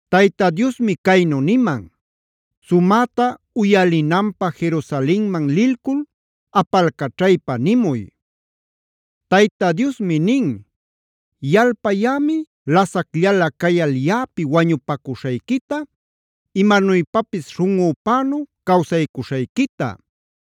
Tayta Diosmi caynu niman: “Sumäta uyalinanpä Jerusalenman lilcul apalcaćhaypa nimuy: “ ‘Tayta Diosmi nin: Yalpayämi lasacllalä cayal yaꞌapi wañupacuśhayquita,a imanuypapis śhunꞌüpänu cawsaycuśhayquita;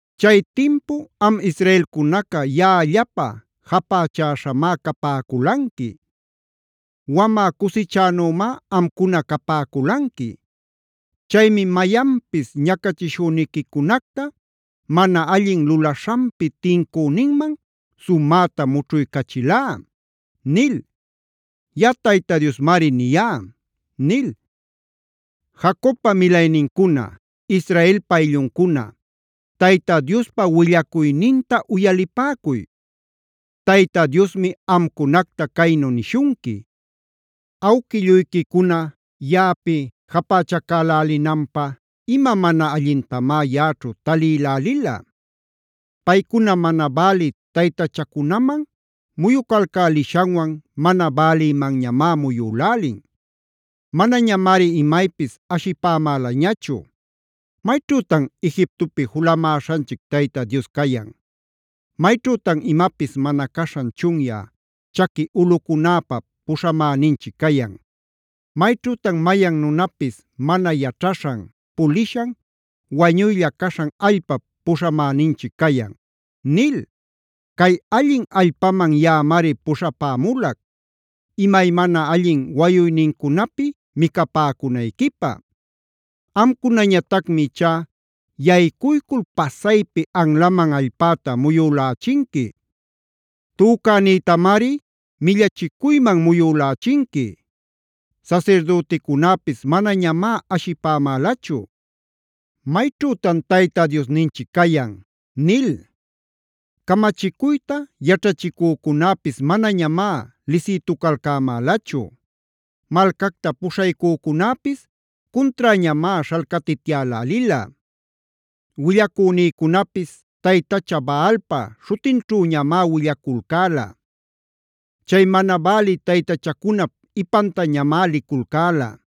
Chay timpu am israelcunaca yaꞌallapä japächäśhamá capäculanqui. Wamä cusichänümá amcuna capäculanqui. Chaymi mayanpis ñacachishüniquicunacta, mana allin lulaśhanpi tincüninman sumäta mućhuycachilá’ nil. Yaꞌa Tayta Diosmari niyá” nil. Jacobpa milaynincuna, Israelpa aylluncuna, Tayta Diospa willacuyninta uyalipäcuy. Tayta Diosmi amcunacta caynu nishunqui: “¿Awquilluyquicuna, yaꞌapi japächacälälinanpä ima mana allintamá yaꞌaćhu talïlälila? Paycuna mana bälï taytachacunaman muyucalcälishanwan mana bälïmanñamá muyülälin. Manañamari imaypis ashipämälañachu: ‘¿Mayćhütan Egiptopi julamäśhanchic Tayta Dios cayan? ¿Mayćhütan imapis mana caśhan chunyä chaqui ulꞌucunäpa puśhamäninchic cayan? ¿Mayćhütan mayan nunapis mana yaćhaśhan, pulishan, wañuylla caśhan allpap puśhamäninchic cayan?’ “Cay allin allpaman yaꞌamari puśhapämulac; imaymana allin wayuynincunapi micapäcunayquipä. Amcunañatacmi ichá yaycuycul pasaypi anlaman allpäta muyülächinqui. Tücänïtamari millachicuyman muyülächinqui. Sasirdüticunäpis manañamá ashipämälachu ‘¿Mayćhütan Tayta Diosninchic cayan?’ nil. Camachicuyta yaćhachïcunäpis manañamá lisïtucalcämälachu. Malcacta puśhaycücunäpis cunträñamá śhalcatityälälila. Willacünïcunapis taytacha Baalpa śhutinćhüñamá willaculcäla; chay mana bälï taytachacunap ipantañamá liculcäla.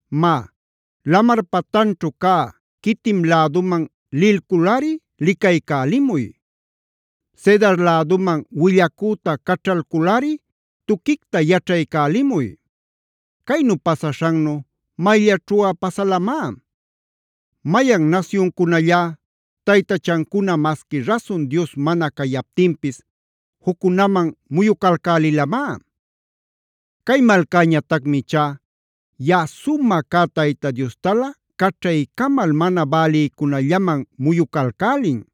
“Má, lamar patanćhu cä Quitim läduman lilculꞌari licaycälimuy. Cedar läduman willacüta caćhalculꞌari tuquicta yaćhaycälimuy. ¿Caynu pasaśhannu mayllaćhuꞌa pasalamá? ¿Mayan nasyuncunallá taytachancuna masqui rasun dios mana cayaptinpis juccunaman muyucalcälilamá?d Cay malcäñatacmi ichá yaꞌa sumä cä Tayta Diostalä caćhaycamal mana bälïcunällaman muyucalcälin.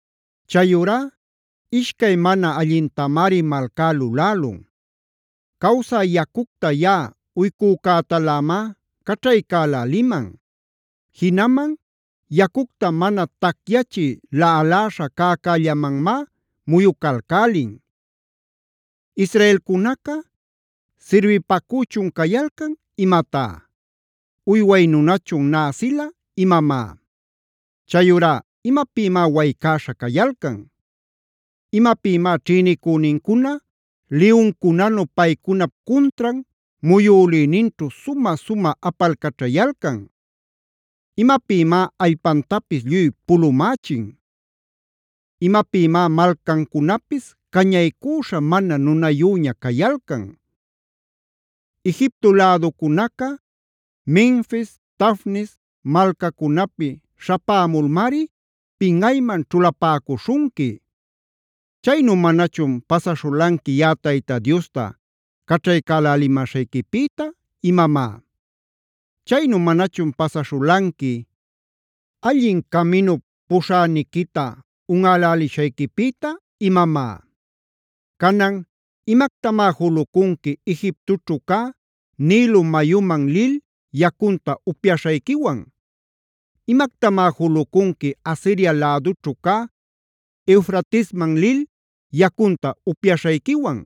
Chayurá ishcay mana allintamari malcá lulälun: Cawsä yacucta yaꞌa uycücätalämá caćhaycäläliman;e jinaman yacucta mana tacyachï laꞌaläśha cäcällamanmá muyucalcälin. “Israelcunaca ¿sirbipacüchun cayalcan imatá? ¿Uyway nunachun näsila imamá? Chayurá ¿imapïmá waycäśha cayalcan? ¿Imapïmá ćhïnicünincuna liyuncunanu paycunap cuntran muyülïninćhu sumä-sumä apalcaćhayalcan? ¿Imapïmá allpantapis lluy pulumächin? ¿Imapïmá malcancunapis cañaycüśha mana nunayüña cayalcan? Egipto läducunaca Menfis, Tafnes malcacunapi śhapämulmari, pinꞌayman ćhulapäcuśhunqui. ¿Chaynu manachun pasaśhulanqui yaꞌa Tayta Diosta caćhaycälälimäśhayquipïta imamá? ¿Chaynu manachun pasaśhulanqui, allin caminup puśhäniquita unꞌälälishayquipïta imamá? “Canan ¿imactamá julucunqui Egiptoćhu cä Nilo mayuman lil, yacunta upyaśhayquiwan?f ¿Imactamá julucunqui Asiria lädućhu cä Eufratesman lil, yacunta upyaśhayquiwan?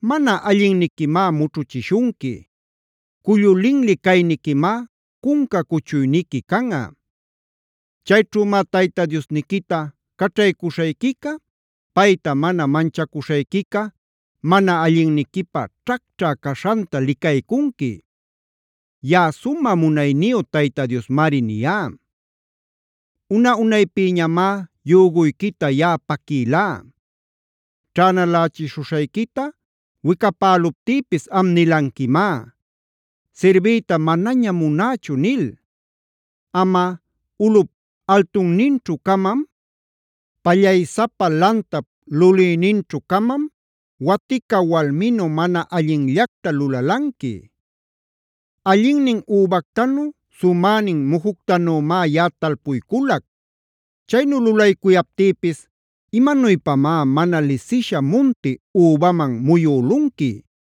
Mana allinniquimá mućhuchishunqui; cullu linli cayniquimá cunca cuchuyniqui canꞌa. Chayćhümá Tayta Diosniquita caćhaycuśhayquica, payta mana manchacuśhayquica mana allinniquipä ćhacćhä caśhanta licaycunqui. Yaꞌa sumä munayniyu Tayta Diosmari niyá. “Una-unaypïñamá yüguyquita yaꞌa paquïlá; ćhänalächishuśhayquita wicapäluptïpis am nilanquimá: ‘Sirbiyta manañam munächu’ nil. Amꞌa, ulꞌup altunninćhu-camam, pallaysapa lantap lulïninćhu-camam watica walminu mana allinllacta lulalanqui. Allinnin übactanu, sumänin mujuctanümá yaꞌa talpuyculac.g Chaynu lulaycuyaptïpis, ¿imanuypamá mana lisisha munti übaman muyülunqui?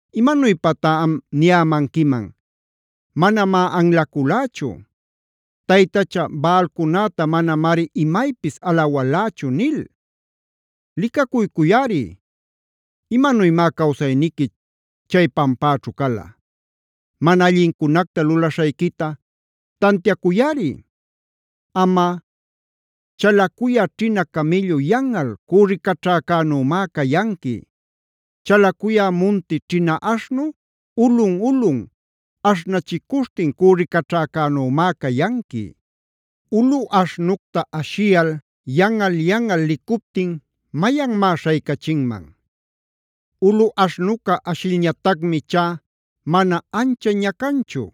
“Imanuypatá am niyämanquiman: ‘Manamá anlaculächu. Taytacha Baalcunäta manamari imaypis alawalächu’ nil. Licacuycuyꞌari, ¿imanuymá cawsayniqui chay pampäćhu cala? Mana allincunacta lulaśhayquita tantiacuyꞌari. Amꞌa chalacuyä ćhina camïllu yanꞌal cürricaćhäcänümá cayanqui. Chalacuyä munti ćhina aśhnu ulꞌun-ulꞌun aśhnachicuśhtin cürricaćhäcänümá cayanqui; ulu aśhnucta ashiyal yanꞌal-yanꞌal licuptin, ¿mayanmá śhaycachinman? Ulu aśhnuca ashilñatacmi ichá mana ancha ñacanchu;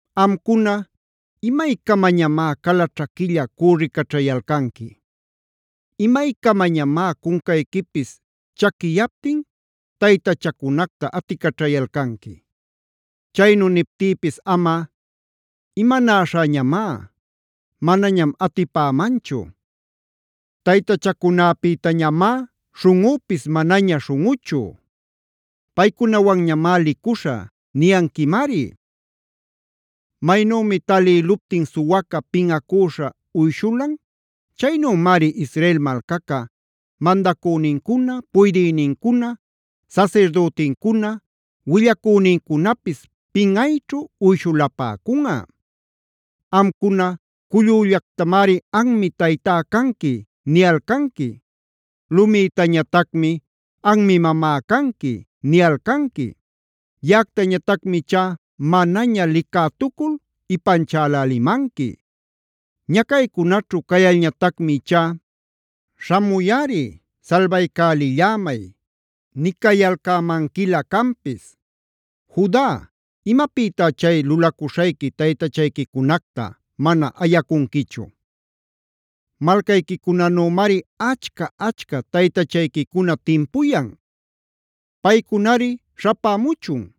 Amcuna, ¿imaycamañamá cala ćhaquilla cürricaćhayalcanqui? ¿Imaycamañamá cuncayquipis chaquiyaptin taytachacunacta aticaćhayalcanqui? Chaynu niptïpis amꞌa: ‘Imanaśhäñamá; manañam atipämanchu. Taytachacunäpïtañamá śhunꞌunpis manaña śhunꞌuchu. Paycunawanñamá licuśhä’ niyanquimari. “Maynümi talïluptin suwaca pinꞌacüśha uyshulan, chaynümari Israel malcaca, mandacünincuna, puydïnincuna, sasirdütincuna, willacünincunapis pinꞌayćhu uyshulapäcunꞌa. Amcuna cullüllactamari ‘Anmi taytá canqui’ niyalcanqui. Lumïtañatacmi ‘Anmi mamá canqui’ niyalcanqui. Yaꞌactañatacmi ichá manaña licätucul ipanchälälimanqui; Ñacaycunaćhu cayalcalñatacmi ichá ‘Śhamuyꞌari, salbaycälillämay’ nicayalcämanquilä canpis. Juda, ¿imapïtá chay lulacuśhayqui taytachayquicunacta mana ayacunquichu? Malcayquicunanümari achca-achca taytachayquicuna timpuyan. Paycunari śhapämuchun;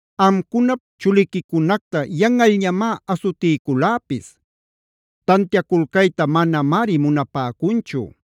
Amcunap chuliquicunacta yanꞌalñamá asutiyculäpis; tantiaculcayta manamari munapäcunchu.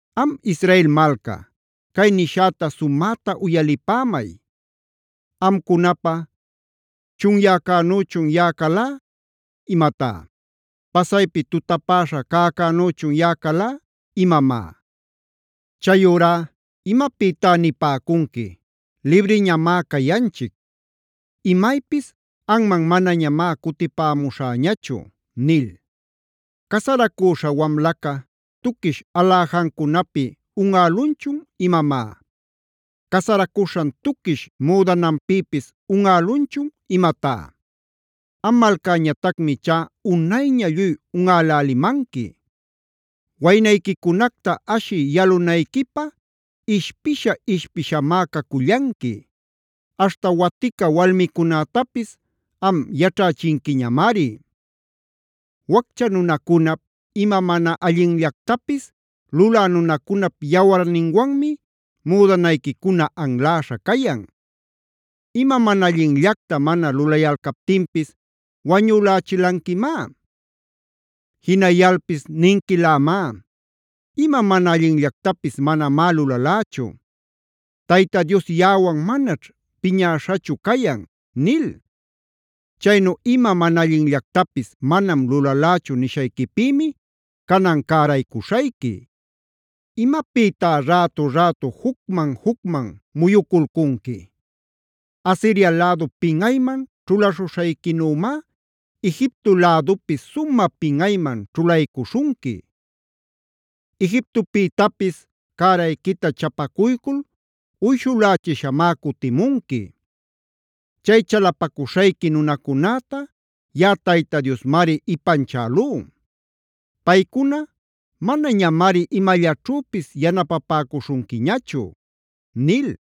“Am Israel malca, cay nishäta sumäta uyalipämay. ¿Amcunapä chunyäcänüchun yaꞌa calá imatá? ¿Pasaypi tutapäśha cäcänüchun yaꞌa calá imamá? Chayurá, ¿imapïtá nipäcunqui: ‘Libriñamá cayanchic. Imaypis anman manañamá cutipämuśhäñachu?’ nil. ¿Casaracüśha wamlaca, tuquish aläjancunapi unꞌälunchun imamá? ¿Casaracuśhan tuquish müdananpïpis unꞌälunchun imatá? Am malcäñatacmi ichá unayña lluy unꞌälälimanqui. “Waynayquicunacta ashï yalunayquipä, ishpisha-ishpishamá cacullanqui; aśhta watica walmicunätapis am yaćhächinquiñamari. Waccha nunacunap, ima mana allinllactapis lulä nunacunap yawarninwanmi müdanayquicuna anläśha cayan. Ima mana allinllacta mana lulayalcaptinpis wañülächilanquimá. Jinayalpis ninquilämá: ‘Ima mana allinllactapis manamá lulalächu. Tayta Dios yaꞌawan manaćh piñäśhachu cayan’ nil. Chaynu ima mana allinllactapis manam lulalächu nishayquipïmi canan cäraycuśhayqui. ¿Imapïtá rätu-rätu jucman-jucman muyuculcunqui? Asiria lädu pinꞌayman ćhulaśhuśhayquinümá, Egipto lädupis sumä pinꞌayman ćhulaycuśhunqui. Egiptopïtapis cärayquita chapacuycul uyshulächishamá cutimunqui. Chay chalapacuśhayqui nunacunäta yaꞌa Tayta Diosmari ipanchälú. Paycuna manañamari imallaćhüpis yanapapäcuśhunquiñachu” nil.